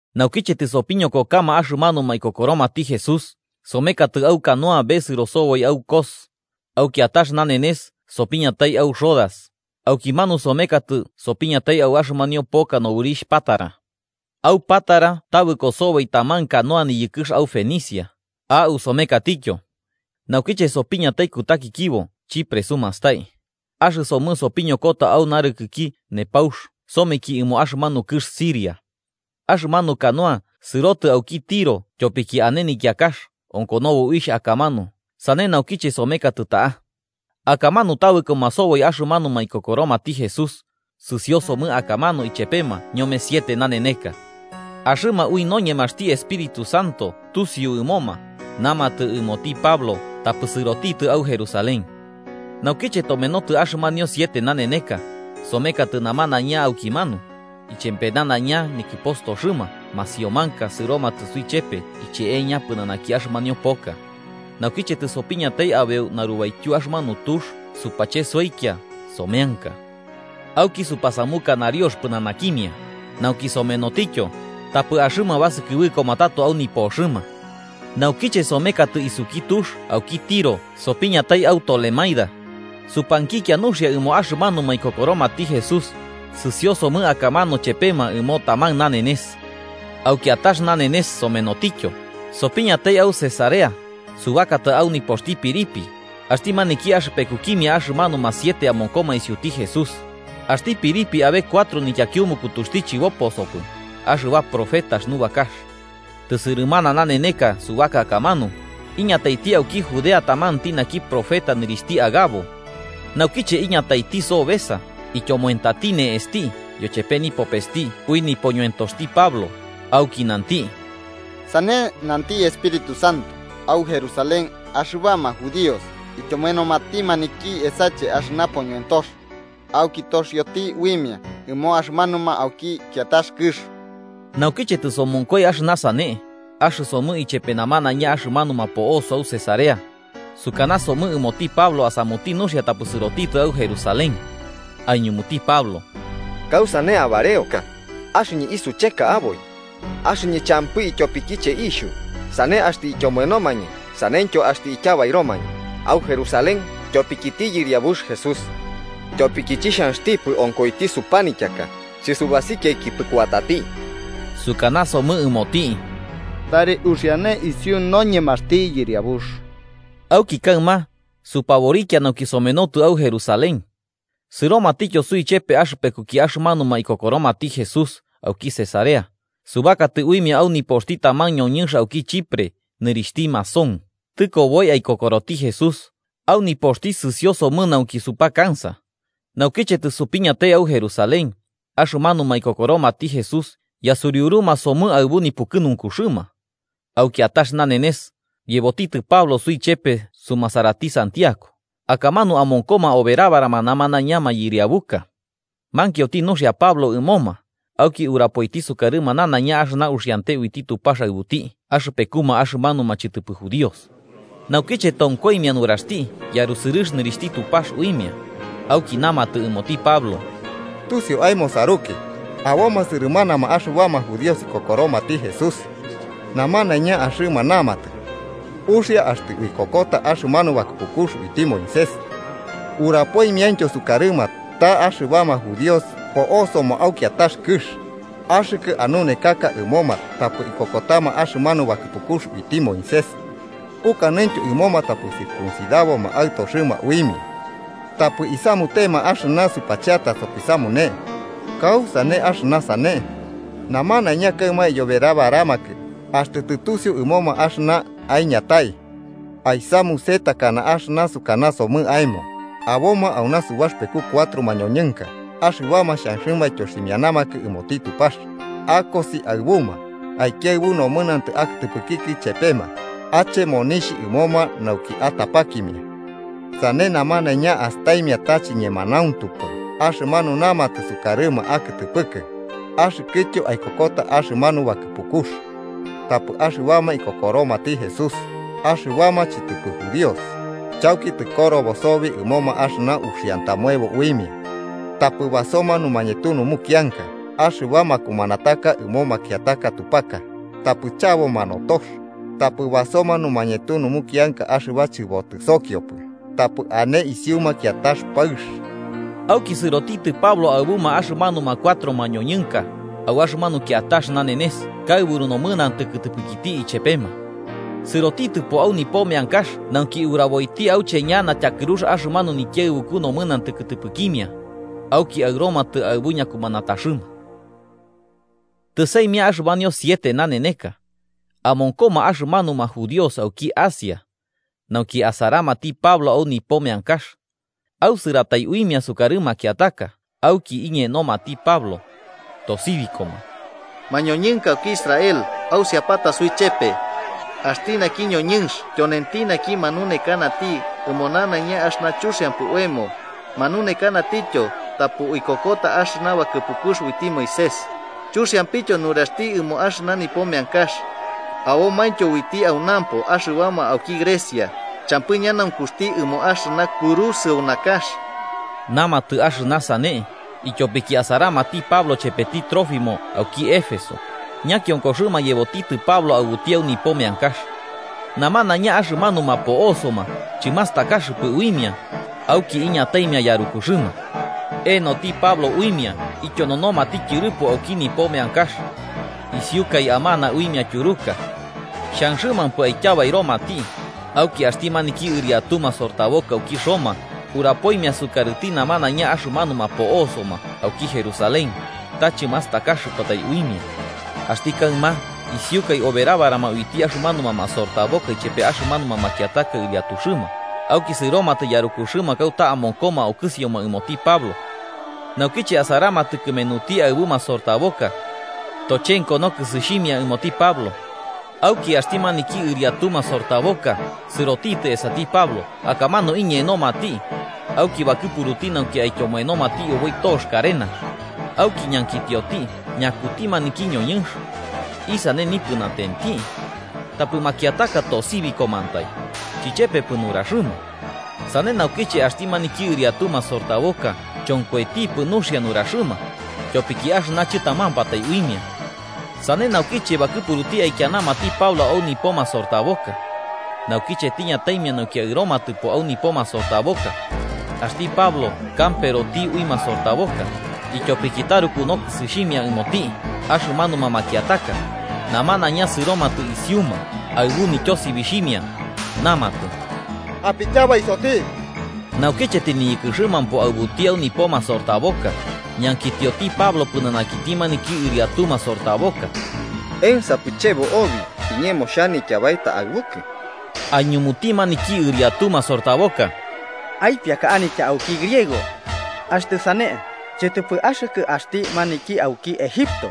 Naukiche tɨsopiñokokama axɨmanuma ikokoromati Jesús, somekatɨ au canoa besɨro soboi au Cos, au kiatax nanenes sopiñatai au Rodas, aukimanu somenotɨ sopiñatai au axɨmanio poka nobɨrixh Pátara. Au Pátara tabɨko soboi taman canoa niyɨkɨx au Fenicia, au somekatityo. Naukiche sopiñatai kutakikibo Chipre sumastai, axɨsomɨ sopiñokota au narɨkɨki nepaux someki ɨmo axɨmanu kɨx Siria. Axɨmanu canoa sɨrotɨ auki Tiro tyopiki ane nikiakax onkonobo uixh akamanu sane naukiche somenotɨ ta'a. Akamanu tabɨkoma soboi axɨmanu ikokoromati Jesús, sɨsiosomɨ akamanu ichepema ñome siete naneneka. Axɨma ui noñemaxti Espíritu Santo tusiu ɨmoma, namatɨ ɨmoti Pablo tapɨ sɨrotitɨ au Jerusalén. Naukiche tomenotɨ axɨmanio siete naneneka, somekatɨ namanaiña aukimanu, ichepe nanaiña nikɨpostoxɨma masiomanka sɨromatɨ suichepe icheeña pɨnanaki axɨmanio poka, naukiche tɨsopiñatai abeu narubaityu axɨmanu tux supachesoikia someanka. Auki supasamuka nariox pɨnanakimia, nauki somenotityo, tapɨ axɨma basɨkɨbɨkoma tato au nipoxɨma. Naukiche somekatɨ isuki tux auki Tiro sopiñatai au Tolemaida, supankikia nuxia ɨmo axɨmanuma ikokoromati Jesús, sɨsiosomɨ akamanu chepema ɨmo taman nanenes. Au kiatax nanenes somenotityo, sopiñatai au Cesarea, subakatɨ au nipoxti Felipe, axti maniki axɨpekukimia axɨmanuma siete amonkoma isiuti Jesús, axti Felipe abe cuatro nityakiumukutuxti chɨboposopɨ, axɨba profetax nubakax. Tɨsɨrɨmana naneneka subaka akamanu, iñataiti auki Judea tamanti naki profeta nɨrixhti Agabo. Naukiche iñataiti sobesa ityomoentati ne'esti yochepe nipopesti ui nipoñoentoxti Pablo, auki nanti: –Sane nanti Espíritu Santo, au Jerusalén axɨbama judíos ityomoenomati maniki esache axɨna poñoentox, auki toxioti uimia ɨmo axɨmanuma auki kiatax kɨx. Naukiche tɨsomonkoi axɨna sane, axɨsomɨ ichepe namanaiña axɨmanuma po'osoma au Cesarea, sukanasomɨ ɨmoti Pablo asamuti nuxia tapɨ sɨrotitɨ au Jerusalén. Aiñumuti Pablo: –¿Kausane abareoka axɨñɨ isucheka aboi? Axɨñɨ champɨ ityopikiche iixhu, sane axtɨ ityomoenomañɨ saneityo axtɨ ityabairomañɨ au Jerusalén tyopikiti Yɨriabux Jesús. Tyopiki chixhanxtipɨ onkoiti supanityaka, chɨsubasikiapɨ kuatati, sukanasomɨ ɨmoti: –Tari uxiane isiu noñemaxti Yɨriabux. Auki kaɨma, supaborikia nauki somenotɨ au Jerusalén. Sɨromatityo suichepe axɨpekuki axɨmanuma ikokoromati Jesús auki Cesarea, subakatɨ uimia au nipoxti taman ñoñɨnx auki Chipre nɨrixhti Mnasón, tɨkoboi aikokoroti Jesús au nipoxti sɨsiosomɨ nauki supakansa. Naukiche tɨsopiñatai au Jerusalén, axɨmanuma ikokoromati Jesús yasuriuruma somɨ aɨbu nipukɨnunkuxɨma. Au kiatax nanenes, yebotitɨ Pablo suichepe sumasarati Santiago, akamanu amonkoma oberabarama namanaiña mayɨriabuka. Mankioti nuxia Pablo ɨmoma, auki urapoiti sukarɨma nanaiña axɨna uxiante uiti Tupax aɨbuti axɨpekuma axɨmanuma chɨtɨpɨ judíos. Naukiche tonkoimia nuraxti, yarusɨrɨx nɨrixhti Tupax uimia. Auki namatɨ ɨmoti Pablo: –Tusio aemo saruki, aboma sɨrɨmanama axɨbama judíos ikokoromati Jesús, namanaiña axɨma namatɨ, uxia axtɨ uikokota axɨmanu bakɨpukux uiti Moisés. Urapoimiaintyo sukarɨma ta axɨbama judíos po'osoma au kiatax kɨx, axɨkɨ anunekaka ɨmoma tapɨ ikokotama axɨmanu bakɨpukux uiti Moisés, ukanɨntyo ɨmoma tapɨ circuncidaboma aɨtoxɨma uimia, tapɨ isamutema axɨna supacheata sopisamune. ¿Kausane axɨna sane? Namanaiña kaɨma iyoberabaramakɨ axtɨ tɨtusiu ɨmoma axɨna aiñatai. Aisamuse takana axɨna sukanasomɨ aemo: Aboma auna subaxɨpeku cuatro mañoñɨnka axɨbama xhanxɨma aityoximianamakɨ ɨmoti Tupax. Akosi aɨbuma, aikiaɨbu nomɨnantɨ akɨtɨpɨkikɨ ichepema, ache monixh ɨmoma nauki atapakimia. Sane namanaiña astaimia ta chiñemanauntupɨ axɨmanu namatɨ sukarɨma akɨtɨpɨkɨ, axɨkɨtyo aikokota axɨmanu bakɨpukux. Tapɨ axɨbama ikokoromati Jesús, axɨbama chɨtɨpɨ judíos, chauki tɨkorobo soboi ɨmoma axɨna uxiantamoebo uimia: Tapɨ basoma numañetu numukianka axɨba makumanataka ɨmo makiataka tupaka, tapɨ chaboma notox, tapɨ basoma numañetu numukianka axɨba chɨbotɨsokiopɨ, tapɨ ane isiuma kiatax paɨx. Auki sɨrotitɨ Pablo aɨbuma axɨmanuma cuatro mañoñɨnka, au axɨmanu kiatax nanenes kaɨburu nomɨnantɨ kɨtɨpɨkiti ichepema. Sɨrotitɨpo au nipo meankax nauki uraboiti auche ñana tyakɨrux axɨmanu nikiaɨbuku nomɨnantɨ kɨtɨpɨkimia, auki aɨromatɨ aɨbu ñakumanataxɨma. Tɨsaimia axɨmanio siete naneneka, amonkoma axɨmanuma judíos auki Asia, naukiche asaramati Pablo au nipo meankax, ausɨratai uimia sukarɨ makiataka, auki iñenomati Pablo, tosibikoma: “¡Mañoñɨnka auki Israel, ausiapata suichepe! Axti naki ñoñɨnx tyonenti naki manunekanati ɨmo nanaiña axɨna chuxiampɨ oemo, manunekanatityo tapɨ uikokota axɨna bakɨpukux uiti Moisés, chuxiampityo nuraxti ɨmo axɨna nipo meankax. Abomaintyo uiti aunampo axɨbama auki Grecia, champɨ ñanaunkuxti ɨmo axɨna kurusɨu nakax.” Namatɨ axɨna sane ityopiki asaramati Pablo chepeti Trófimo auki Éfeso, ñakionkoxɨma yebotitɨ Pablo aɨbuti au nipo meankax. Namanaiña axɨmanuma po'osoma chɨmastakaxɨpɨ uimia, auki iñataimia yarukuxɨma. Enoti Pablo uimia ityononomati tyɨrɨpo auki nipo meankax, isiukai amana uimia tyuruka. Xhanxɨmampɨ aityabairomati, auki axti maniki ɨriatu masortaboka auki Roma, urapoimia sukarɨti namanaiña axɨmanuma po'osoma auki Jerusalén ta chɨmastakaxɨpatai uimia. Axti kaɨma isiukai oberabarama uiti axɨmanuma masortaboka ichepe axɨmanuma makiataka ɨriatuxɨma, auki sɨromatɨ yarukuxɨma kauta amonkoma okɨsioma ɨmoti Pablo. Naukiche asaramatɨ kɨmenuti aɨbu masortaboka, tochenko nokɨsixhimia ɨmoti Pablo. Auki axti maniki ɨriatu masortaboka sɨrotitɨ esati Pablo akamanu iñenomati auki bakɨpuruti nauki aityomoenomati oboi tox karenax. Auki ñankitioti, ñakuti maniki ñoñɨnx, isane nipɨnatenti. Tapɨ makiataka tosibikomantai, chichepepɨ nuraxɨma. Sane naukiche axti maniki ɨriatu masortaboka chonkoitipɨ nuxia nuraxɨma, tyopiki axɨna chɨtamampatai uimia. Sane naukiche bakɨpuruti aikianamati Pablo au nipo masortaboka. Naukiche tiñataimia nauki aɨromatɨpo au nipo masortaboka, axti Pablo kamperoti ui masortaboka, ityopiki taruku nokɨsixhimia ɨmoti axɨmanuma makiataka. Namanaiña sɨromatɨ isiuma aɨbu nityosibixhimia namatɨ: “¡Apityabaisoti!” Naukiche tɨniyɨkɨxɨmampo aɨbuti au nipo masortaboka, ñankitioti Pablo pɨnanakiti maniki ɨriatu masortaboka: –¿Ensapɨ chebo obi iñemo xhanitya baeta aɨbukɨ? Aiñumuti maniki ɨriatu masortaboka: –¿Aipiaka anitya auki Griego? Axtɨ sane, ¿chɨtɨpɨ axɨkɨ axti maniki auki Egipto,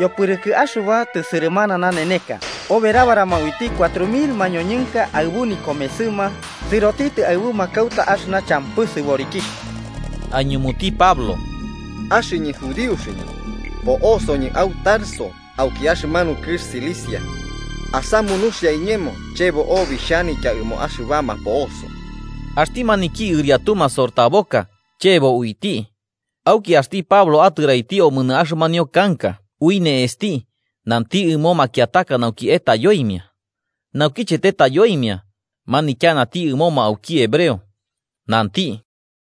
yopɨrɨkɨ axɨba tɨsɨrɨmana naneneka oberabarama uiti cuatro mil mañoñɨnka aɨbu nikomesɨma sɨrotitɨ aɨbuma kauta axɨna champɨ sɨborikixh? Aiñumuti Pablo: –Axɨñɨ judíoxɨñɨ, po'osoñɨ au Tarso auki axɨmanu kɨx Cilicia. Asamu nuxia iñemo, chebo obi xhanitya ɨmo axɨbama po'oso. Axti maniki ɨriatu masortaboka chebo uiti, auki axti Pablo atɨraiti omonɨ axɨmanio kanka ui ne'esti nanti ɨmo makiataka nauki etaiyoimia. Naukiche tetayoimia, manityanati ɨmoma auki hebreo, nanti: